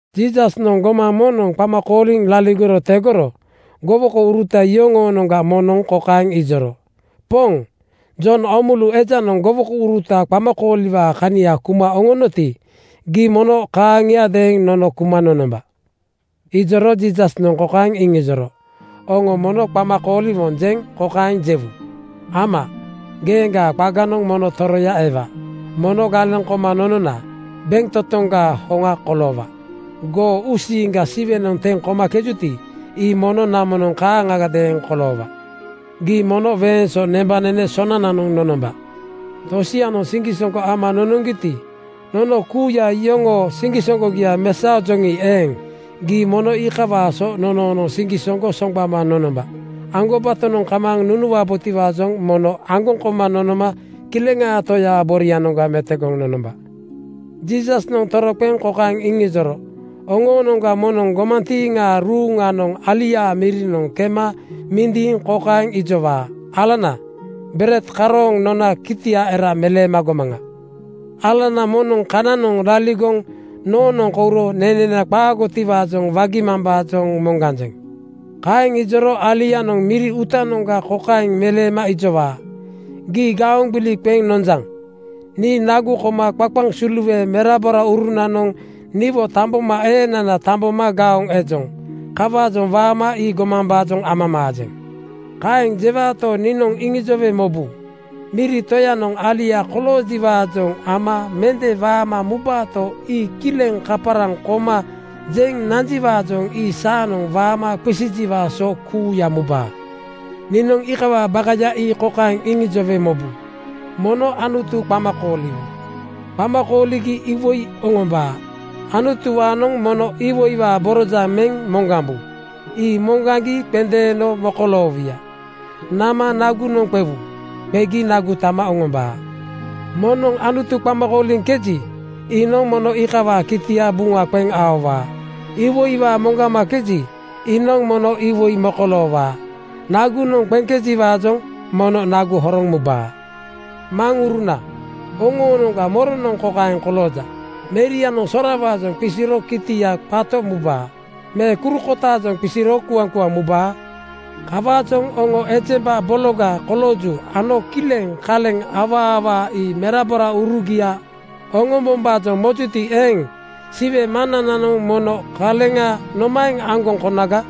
Jiisasnoŋ gomaŋ moŋnoŋ qama kooliŋ laligoro tegoro gowokouruta yoŋoonoŋga moŋnoŋ kokaeŋ ijoro, “Poŋ, Jon Oomulu ejanoŋ gowokouruta qamakooliwaa kania kuma oŋonoti, gii mono kaaŋiadeeŋ nono kuma nonomba.” Ijoro Jiisasnoŋ kokaeŋ iŋijoro, “Oŋo mono qama kooliwonjeŋ kokaeŋ jewu: Ama, geeŋgaa qaganoŋ mono toroya ewa. Mono galeŋ koma nonona bentotoŋgaa hoŋa koloowa. (Goo uusiiŋga Siwenoŋ teŋ komakejuti, ii mono namonoŋ kaaŋagadeeŋ koloowa.) Gii mono weeŋ so nembanene sonananoŋ nonomba. Tosianoŋ siŋgisoŋgo ama nonoŋgiti, nono kuuya iyoŋoo siŋgisoŋgogia ii mesaojoŋi eeŋ, gii mono iikawaa so nonoonoŋ siŋgisoŋgo soŋgbama nonomba. Aŋgobatonoŋ kamaaŋ nunuwabotiwaajoŋ mono aŋgoŋ koma nonoma Kileŋaa Toyaa borianoŋga metogoŋ nonomba.” Jiisasnoŋ toroqeŋ kokaeŋ iŋijoro, “Oŋoonoŋga moŋnoŋ gomantiiŋaa ruuŋanoŋ aliaa mirinoŋ kema mindiiŋ kokaeŋ ijowaa, ‘Alana, bered karooŋ nona kitia era meleema gomaŋa. Alana moŋnoŋ kananoŋ laligoŋ noonoŋ kouro nenena qaagotiwaajoŋ wagimambaajoŋ moŋganjeŋ.’ Kaeŋ ijoro alianoŋ miri uutanoŋga kokaeŋ meleema ijowaa, ‘Gii gaoŋ gbili qeŋ nononjaŋ. Nii nagu koma qaqaŋ suluwe meraboraurunanoŋ niwo tambomaeenana tamboma gaoŋ ejoŋ. Kawaajoŋ waama ii gomambaajoŋ amamaajeŋ.’ Kaeŋ jewaato, niinoŋ iŋijowe mobu: Miri toyanoŋ alia koloojiwaajoŋ ama mende waama mubaato, ii kileŋ kaparaŋ koma jeŋ nanjiwaajoŋ ii saanoŋ waama qisijiwaa so kuuya mubaa. “Niinoŋ iikawaa bakaya ii kokaeŋ iŋijowe mobu: Mono Anutu qama kooliwu. Qama kooligi iwoi oŋombaa. Anutuwaanoŋ mono iwoiwaa borojaŋ meŋ moŋgambu. Ii moŋgaŋgi qendeeno mokoloowuya. Nama nagunoŋ qewu. Qegi nagu tama oŋombaa. Moŋnoŋ Anutu qama kooliŋkeji, iinoŋ mono iikawaa kitia buŋa qeŋ aowaa. Iwoiwaa moŋgamakeji, iinoŋ mono iwoi mokoloowaa. Nagunoŋ qeŋkejiwaajoŋ mono nagu horoŋ mubaa. “Maŋuruna oŋoonoŋga moronoŋ kokaeŋ kolooja: Merianoŋ sorawaajoŋ qisiro kitianoŋ qato mubaa me kuru kotaajoŋ qisiro kuaŋkuaŋ mubaa? Kawaajoŋ oŋo ejemba bologa kolooju ano kileŋ kaleŋ awaa awaa ii meraboraurugia oŋombombaajoŋ mojuti eeŋ, Siwe Maŋnananoŋ mono kaleŋa nomaeŋ aŋgoŋ konaga?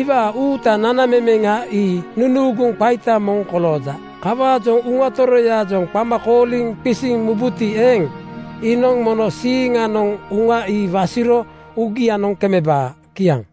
Iwaa uutaa nanamemeŋa ii nunuuguŋ qaita moŋ kolooja. Kawaajoŋ Uŋa Toroyaajoŋ qama kooliŋ qisiŋ mubuti eeŋ, iinoŋ mono siiŋanoŋ Uŋa ii wasiro uugianoŋ kemebaa.” Kiaŋ.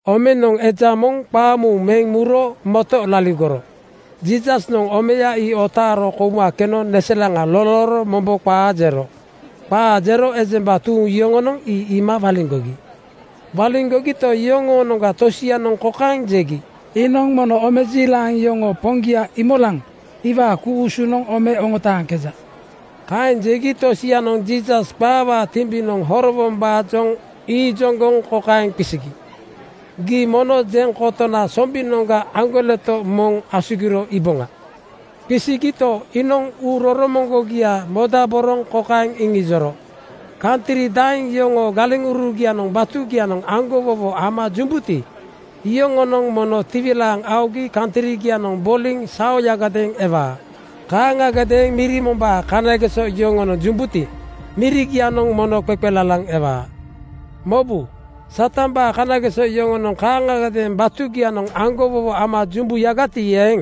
Omenoŋ eja moŋ qaamuuŋ meŋ muro moto laligoro Jiisasnoŋ omeya ii otaaro kouma keno neselaŋa lolooro mombo qaa jero. Qaa jero ejemba tuuŋ yoŋonoŋ ii iima waliŋgogi. Waliŋgogito, yoŋoonoŋga tosianoŋ kokaeŋ jegi, “Iinoŋ mono omejiilaŋ yoŋoo poŋgia Iimolaŋ iwaa ku-usunoŋ ome oŋotaaŋkeja.” Kaeŋ jegi tosianoŋ Jiisas qaawaa timbinoŋ horowombaajoŋ iijoŋgoŋ kokaeŋ qisigi, “Gii mono jeŋ kotona sombinoŋga aŋgoleto moŋ asugiro iiboŋa.” Qisigito, iinoŋ uu roromoŋgogia modaboroŋ kokaeŋ iŋijoro, “Kantri daeŋ yoŋoo galeŋurugianoŋ batugianoŋ aŋgowowo ama jumbuti, iyoŋonoŋ mono tiwilaaŋ aogi kantrigianoŋ boliŋ saoyagadeeŋ ewaa. Kaaŋagadeeŋ miri mombaa kanageso yoŋonoŋ jumbuti, mirigianoŋ mono qeqelalaŋ ewaa. “Mobu! Satambaa kanageso yoŋonoŋ kaaŋagadeeŋ batugianoŋ aŋgowowo ama jumbuyagati eeŋ,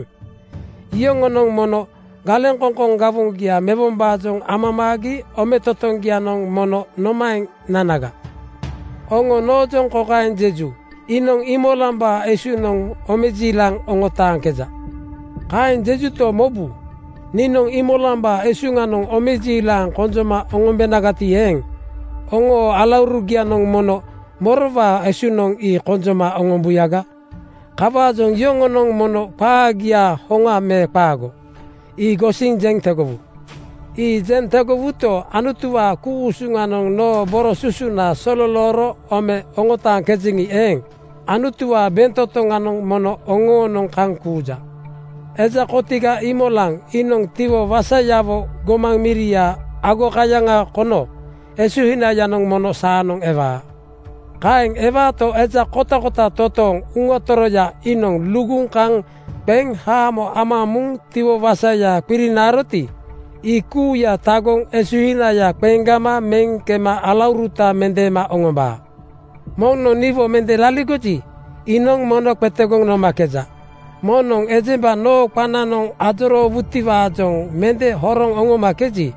iyoŋonoŋ mono galeŋkoŋkoŋ gawoŋgia mewombaajoŋ amamaagi ometotoŋgianoŋ mono nomaeŋ nanaga? Oŋo noojoŋ kokaeŋ jeju: Iinoŋ Iimolambaa esuŋnoŋ omejiilaŋ oŋotaaŋkeja. Kaeŋ jejuto, mobu, niinoŋ Iimolambaa esuŋnoŋ omejiilaŋ konjoma oŋombenagati eeŋ, oŋoo alaurugianoŋ mono morowaa esuŋnoŋ ii konjoma oŋombuyaga? Kawaajoŋ yoŋonoŋ mono qaagia hoŋa me qaago, ii gosiŋ jeŋ tegowu. Ii jeŋ tegowuto, Anutuwaa ku-usuŋanoŋ noo boro susuna sololooro ome oŋotaaŋkejeŋi eeŋ, Anutuwaa bentotoŋanoŋ mono oŋoonoŋ kaŋ kuuja. “Eja kotiga Iimolaŋ iinoŋ tiwo wasayawo gomaŋ miria agokayaŋ kono esuhinayanoŋ mono saanoŋ ewaa. Kaeŋ ewaato, eja kotakota totooŋ Uŋa Toroya iinoŋ luguŋ kaŋ qeŋ haamo ama muŋ tiwo wasaya qirinaaroti, ii kuuya tagoŋ esuhinaya qeŋgama meŋ kema alauruta mendeema oŋombaa. “Moŋnoŋ niwo mende laligoji, iinoŋ mono qetegoŋ nomakeja. Moŋnoŋ ejemba noo qananoŋ ajoroowutiwaajoŋ mende horoŋ oŋomakeji,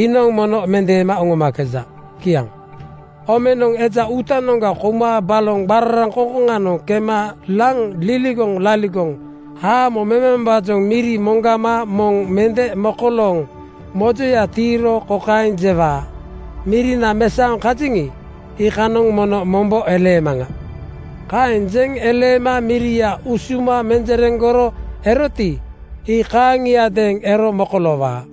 iinoŋ mono mendeema oŋomakeja.” Kiaŋ. “Omenoŋ eja uutanoŋga kouma baloŋ qararaŋkoŋkoŋanoŋ kema laŋ liligoŋ laligoŋ haamo memambaajoŋ miri moŋgama moŋ mende mokolooŋ mojoya tiiro kokaeŋ jewaa, ‘Mirina mesaoŋ kajeŋi, iikanoŋ mono mombo eleemaŋa.’ Kaeŋ jeŋ eleema miria usuma menjereŋgoro eroti, ii kaaŋiadeeŋ ero mokoloowaa.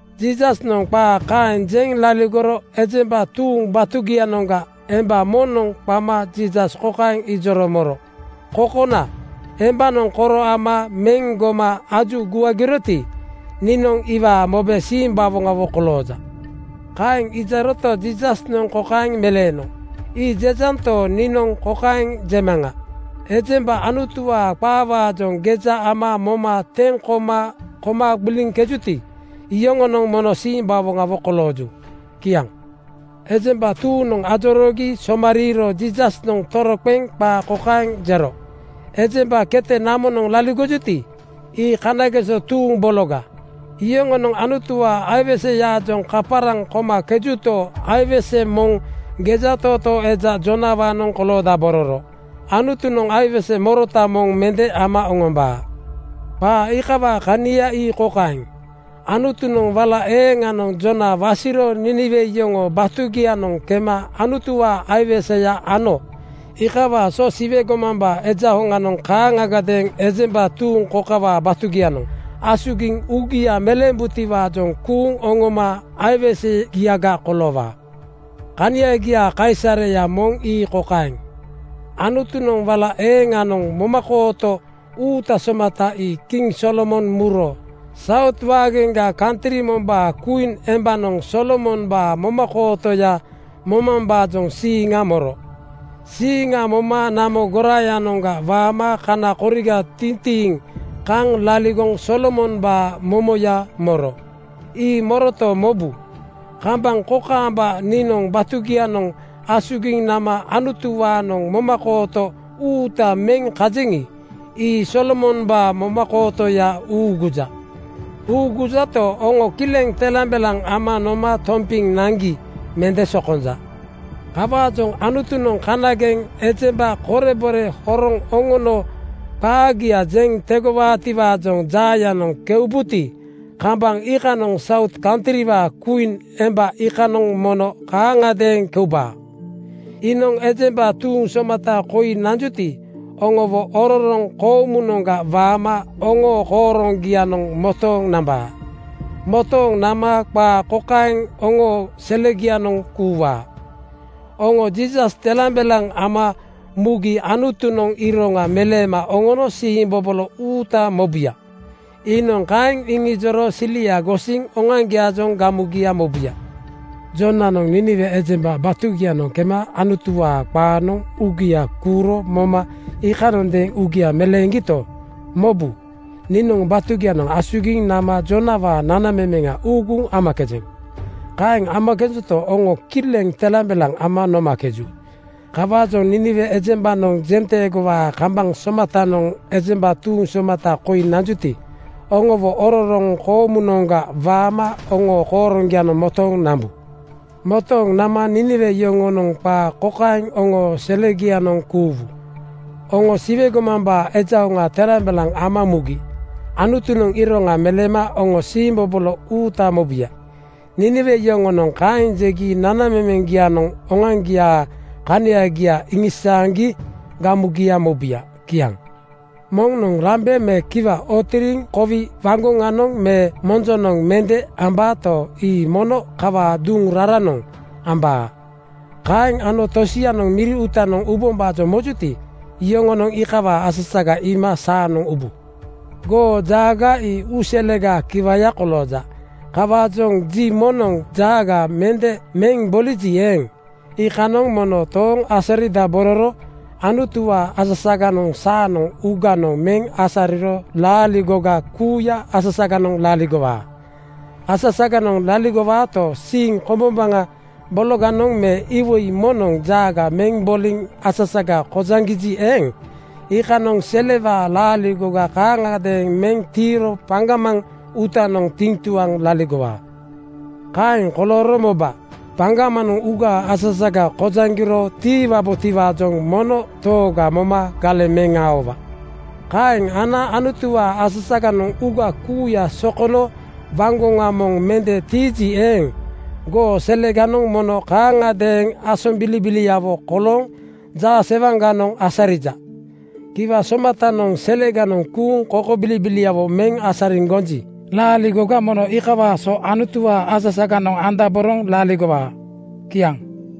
Jiisasnoŋ qaa kaeŋ jeŋ laligoro ejemba tuuŋ batugianoŋga emba moŋnoŋ qama Jiisas kokaeŋ ijoro moro, “Kokona, embanoŋ koro ama meŋ goma aju guagiroti, niinoŋ iwaa mobe simbawoŋawo kolooja.” Kaeŋ ijoroto, Jiisasnoŋ kokaeŋ meleeno, “Ii jejanto, niinoŋ kokaeŋ jemaŋa: Ejemba Anutuwaa qaawaajoŋ geja ama moma teŋ koma koma gbiliŋkejuti, iyoŋonoŋ mono simbawoŋawo kolooju.” Kiaŋ. Ejemba tuuŋnoŋ ajoroogi somariiro Jiisasnoŋ toroqeŋ qaa kokaeŋ jero, “Ejemba kete namonoŋ laligojuti, ii kanageso tuuŋ bologa. Yoŋonoŋ Anutuwaa aiweseyaajoŋ kaparaŋ komakejuto, aiwese moŋ gejatootoo eja Joonawaanoŋ koloodabororo. Anutunoŋ aiwese morota moŋ mende ama oŋombaa. Qaa iikawaa kania ii kokaeŋ: Anutunoŋ wala eeŋanoŋ Joona wasiro Niiniwe yoŋoo batugianoŋ kema Anutuwaa aiweseya ano. Iikawaa so Siwe gomambaa Eja hoŋanoŋ kaaŋagadeeŋ ejemba tuuŋ kokawaa batugianoŋ asugiŋ uugia meleembutiwaajoŋ kuuŋ oŋoma aiwesegiaga koloowaa. “Kaniagiaa kaisareya moŋ ii kokaeŋ: Anutunoŋ wala eeŋanoŋ momakooto uuta somata ii kiŋ Solomon muro Saut waageŋga kantri mombaa kwiin embanoŋ Solomombaa momakootoya momambaajoŋ siiŋa moro. Siiŋa moma namo goraayanoŋga waama kana koriga tintiŋ kaŋ laligoŋ Solomombaa momoya moro. Ii moroto, mobu, kambaŋ kokaamba niinoŋ batugianoŋ asugiŋ nama Anutuwaanoŋ momakooto uuta meŋ kajeŋi, ii Solomombaa momakootoya uuguja. Uugujato, oŋo kileŋ telambelaŋ ama noma tompiŋ naŋgi mende sokonja. “Kawaajoŋ Anutunoŋ kanageŋ ejemba korebore horoŋ oŋono qaagia jeŋ tegowaatiwaajoŋ jaayanoŋ keubuti, kambaŋ iikanoŋ Saut kantriwaa kwiin emba iikanoŋ mono kaaŋagadeeŋ keubaa. Iinoŋ ejemba tuuŋ somata koi nanjuti, oŋowo ororoŋ koomunoŋga waama oŋoo kooroŋgianoŋ motooŋ nambaa. Motooŋ nama qaa kokaeŋ oŋoo selegianoŋ kuuwaa, ‘Oŋo Jiisas telambelaŋ ama mugi Anutunoŋ iroŋa meleema oŋono siimbobolo uuta mobuya.’ Iinoŋ kaeŋ iŋijoro silia gosiŋ oŋoaŋgiaajoŋ gamugia mobuya. “Joonanoŋ Niiniwe ejemba batugianoŋ kema Anutuwaa qaanoŋ uugia kuuro moma iikanondeeŋ uugia meleeŋgito, mobu, niinoŋ batugianoŋ asugiŋ nama Joonawaa nanamemeŋa uuguŋ amakejeŋ. Kaeŋ amakejento, oŋo kileŋ telambelaŋ ama nomakeju. Kawaajoŋ Niiniwe ejembanoŋ jenteegowaa kambaŋ somatanoŋ ejemba tuuŋ somata koi nanjuti, oŋowo ororoŋ koomunoŋga waama oŋoo kooroŋgianoŋ motooŋ nambu. Motooŋ nama Niiniwe yoŋonoŋ qaa kokaeŋ oŋoo selegianoŋ kuuwu, ‘Oŋo Siwe gomambaa Eja hoŋa telambelaŋ ama mugi Anutunoŋ iroŋa meleema oŋono siimbobolo uuta mobuya.’ Niiniwe yoŋonoŋ kaeŋ jegi nanamemeŋ-gianoŋ oŋoaŋgiaa kaniagia iŋisaaŋgi gamugia mobuya.” Kiaŋ. “Moŋnoŋ lambe me kiwa ootiriŋ kowi waŋgoŋanoŋ me monjonoŋ mende ambaato, ii mono kawaa duŋ raranoŋ ambaa. Kaeŋ ano tosianoŋ miri uutanoŋ ubombaajoŋ mojuti, yoŋonoŋ iikawaa asasaga iima saanoŋ ubu. Goo jaaga ii uu selegaa kiwaya kolooja. Kawaajoŋ ji moŋnoŋ jaaga mende meŋ boliji eeŋ, iikanoŋ mono tooŋ asaridabororo Anutuwaa asasaganoŋ saanoŋ uuganoŋ meŋ asariro laaligoga kuuya asasaganoŋ laligowaa. Asasaganoŋ laligowaato, siiŋ kombombaŋa bologanoŋ me iwoi moŋnoŋ jaaga meŋ boliŋ asasaga kojaŋgiji eeŋ, iikanoŋ selewaa laaligoga kaaŋagadeeŋ meŋ tiiro paŋgamaŋ uutanoŋ tiŋtuaŋ laligowaa. “Kaeŋ kolooro moba, paŋgamanoŋ uugaa asasaga kojaŋgiro tiiwabotiwaajoŋ mono tooga moma galeŋ meŋ aowa. Kaeŋ ana Anutuwaa asasaganoŋ uuga kuuya sokono waŋgoŋa moŋ mende tiiji eeŋ, goo seleganoŋ mono kaaŋagadeeŋ asombilibiliawo kolooŋ jaasewaŋganoŋ asarija. Kiwa somatanoŋ seleganoŋ kuuŋ kokobilibiliawo meŋ asariŋ gonji, laaligoga mono iikawaa so Anutuwaa asasaganoŋ andaboroŋ laligowaa.” Kiaŋ.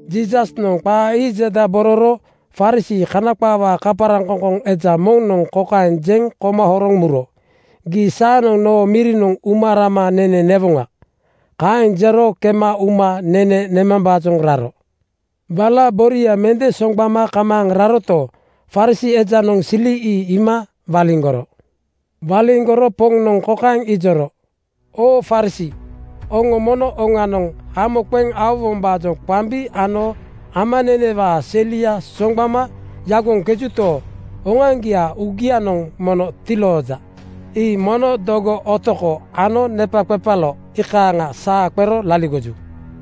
Jiisasnoŋ qaa ii jedabororo Farisii (Kana qaawaa kaparaŋ-koŋkoŋ) eja moŋnoŋ kokaeŋ jeŋ koma horoŋ muro, “Gii saanoŋ noo mirinoŋ uma rama nene newoŋa.” Kaeŋ jero kema uma nene nemambaajoŋ raro. Wala boria mende soŋgbama kamaaŋ raroto, Farisii ejanoŋ sili ii iima waliŋgoro. Waliŋgoro Poŋnoŋ kokaeŋ ijoro, “Oo Farisii oŋo mono oŋanoŋ hamo qeŋ aowombaajoŋ qambi ano amanenewaa selia soŋgbama yagoŋkejuto, oŋoaŋgiaa uugianoŋ mono tilooja. Ii mono dogo, otoko ano nepaqepalo iikanoŋ saa qero laligoju.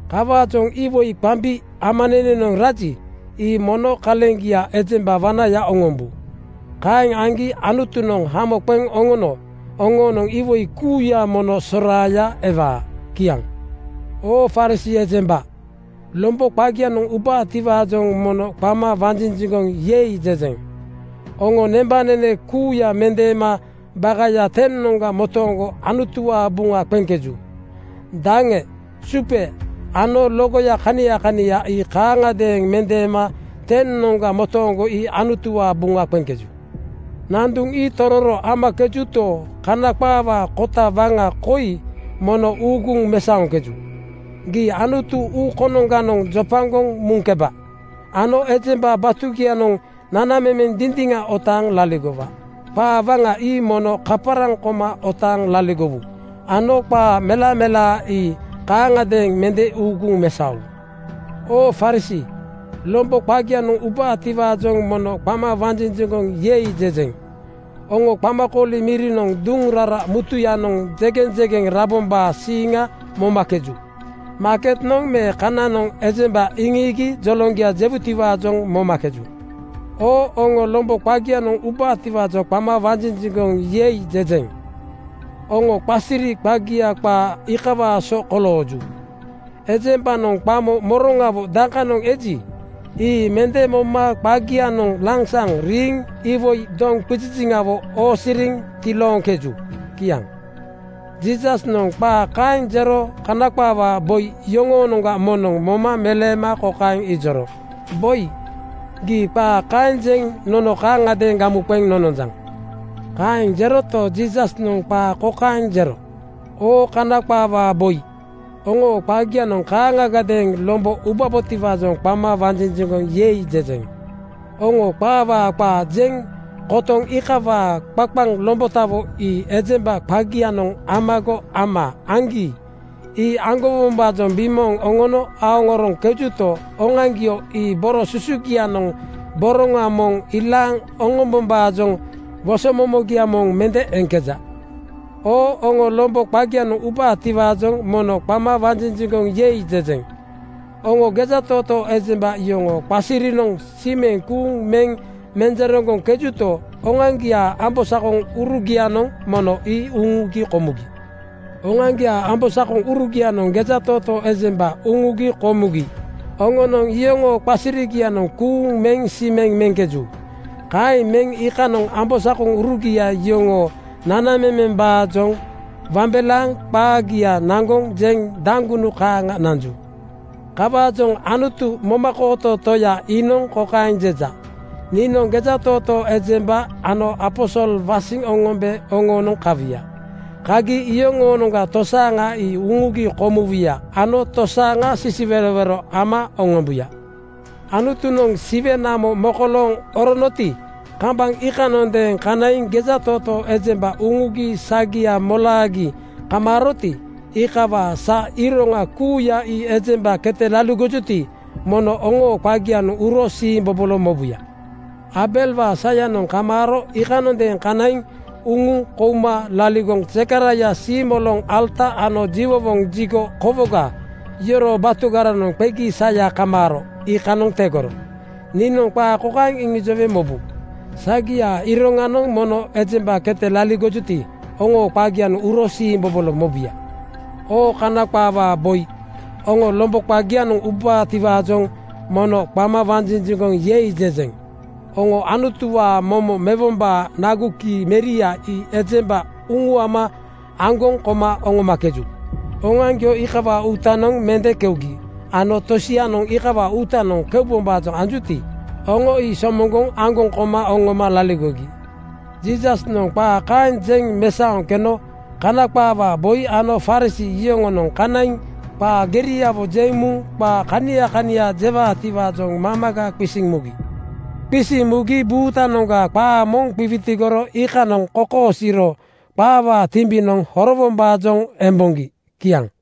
Kawaajoŋ iwoi qambi, amanenenoŋ raji, ii mono kaleŋgia ejemba wanaya oŋombu. Kaeŋ aŋgi Anutunoŋ hamo qeŋ oŋono oŋoonoŋ iwoi kuuya mono soraaya ewaa.” Kiaŋ. “Oo Farisii ejemba, lombo qagianoŋ ubaatiwaajoŋ mono qama wanjinjiŋgoŋ ‘Yei!’ jejeŋ. Oŋo nembanene kuuya mendeema bakaya 10:noŋga motooŋgo Anutuwaa buŋa qeŋkeju. Daŋe, supe ano logoya kania kania ii kaaŋagadeeŋ mendeema tenoŋga motooŋgo ii Anutuwaa buŋa qeŋkeju. Nanduŋ ii tororo amakejuto, Kana qaawaa kota waŋa koi mono uuguŋ mesaoŋkeju: Gii Anutu uu konoŋganoŋ jopagoŋ muŋkeba ano ejemba batugianoŋ nanamemeŋ dindiŋa otaaŋ laligowa. Qaa waŋa ii mono kaparaŋ koma otaaŋ laligowu ano qaa melamelaa ii kaaŋagadeeŋ mende uuguŋ mesaowu. “Oo Farisii, lombo qagianoŋ ubaatiwaajoŋ mono qama wanjinjiŋgoŋ ‘Yei!’ jejeŋ. Oŋo qamakooli mirinoŋ duŋ rara mutuyanoŋ jegeŋjegeŋ rabombaa siiŋa momakeju. Maaketnoŋ me kananoŋ ejemba iŋiigi joloŋgia jewutiwaajoŋ momakeju. Oo oŋo, lombo qagianoŋ ubaatiwaajoŋ qama wanjinjiŋgoŋ ‘Yei!’ jejeŋ. Oŋo qasiri qagia qaa iikawaa so kolooju. Ejembanoŋ qamo moroŋawo dakanoŋ eji, ii mende moma qagianoŋ lansaŋ riiŋ iwoi doŋqiziziŋawo oosiriŋ tilooŋkeju.” Kiaŋ. Jiisasnoŋ qaa kaeŋ jero Kana qaawaa boi yoŋoonoŋga moŋnoŋ moma meleema kokaeŋ ijoro, “Boi, gii qaa kaeŋ jeŋ nono kaaŋagadeeŋ gamu qeŋ nononjaŋ.” Kaeŋ jeroto, Jiisasnoŋ qaa kokaeŋ jero, “Oo Kana qaawaa boi, oŋoo qagianoŋ kaaŋagadeeŋ lombo ubaatiwaajoŋ qama wanjinjiŋgoŋ ‘Yei!’ jejeŋ. Oŋo qaawaa qaa jeŋ kotoŋ iikawaa qaqaŋ lombotawo ii ejemba qagianoŋ amago ama aŋgi ii aŋgowombaajoŋ bimooŋ oŋono aoŋoroŋkejuto, oŋoaŋgio ii boro susugianoŋ boroŋa moŋ ilaaŋ oŋombombaajoŋ wosomomogia moŋ mende eŋkeja. “Oo oŋo, lombo qagianoŋ ubaatiwaajoŋ mono qama wanjinjiŋgoŋ ‘Yei!’ jejeŋ. Oŋo gejatootoo ejemba yoŋoo qasirinoŋ simeŋ kuuŋ meŋ menjereŋgoŋkejuto, oŋoaŋgiaa ambosakoŋuru-gianoŋ mono ii uŋugi komugi. Oŋoaŋgiaa ambosakoŋurugianoŋ gejatootoo ejemba uŋugi komugi oŋonoŋ iyoŋoo qasirigianoŋ kuuŋ meŋ simeŋ meŋkeju. Kaeŋ meŋ iikanoŋ ambosakoŋurugia yoŋoo nanamemembaajoŋ wambelaaŋ qaagia naŋgoŋ jeŋ daŋgunu kaaŋa nanju. “Kawaajoŋ Anutu, momakooto Toya iinoŋ kokaeŋ jeja, ‘Niinoŋ gejatootoo ejemba ano aposol wasiŋ oŋombe oŋoonoŋ kawuya. Kagi iyoŋoonoŋga tosaaŋa ii uŋugi komuwuya ano tosaaŋa sisiwerowero ama oŋombuya.’ “Anutunoŋ Siwe namo mokolooŋ oronoti, kambaŋ iikanoŋadeeŋ kanaiŋ gejatootoo ejemba uŋugi sagia molaagi kamaaroti, iikawaa sa iroŋa kuuya ii ejemba kete laligojuti, mono oŋoo qagianoŋ uro siimbobolo mobuya. Aabelwaa sayanoŋ kamaaro iikanoŋadeeŋ kanaiŋ uŋuŋ kouma laligoŋ Zekaraia siimoloŋ alata ano jiwowoŋ jigo kowoga yoroo batugaranoŋ qegi saya kamaaro iikanoŋ tegoro. Niinoŋ qaa kokaeŋ iŋijowe mobu: Sagiaa iroŋanoŋ mono ejemba kete laligojuti, oŋoo qagianoŋ uro siimbobolo mobuya. “Oo Kana qaawaa boi oŋo, lombo qagianoŋ ubaatiwaajoŋ mono qama wanjinjiŋgoŋ ‘Yei!’ jejeŋ. Oŋo Anutuwaa momo mewombaa nagu kii meria ii ejemba uŋuama aŋgoŋ koma oŋomakeju. Oŋoaŋgio iikawaa uutanoŋ mende keugi ano tosianoŋ iikawaa uutanoŋ keubombaajoŋ anjuti, oŋonoŋ ii somoŋgoŋ aŋgoŋ koma oŋoma laligogi.” Jiisasnoŋ qaa kaeŋ jeŋ mesaoŋ keno Kana qaawaa boi ano Farisii yoŋonoŋ kanaiŋ qaa geriawo jeŋ muŋ qaa kania kania jewaatiwaajoŋ mamaga qisiŋ mugi. Qisiŋ mugi buutanoŋga qaa moŋ qiwitigoro iikanoŋ kokosiiro qaawaa timbinoŋ horowombaajoŋ emboŋgi. Kiaŋ.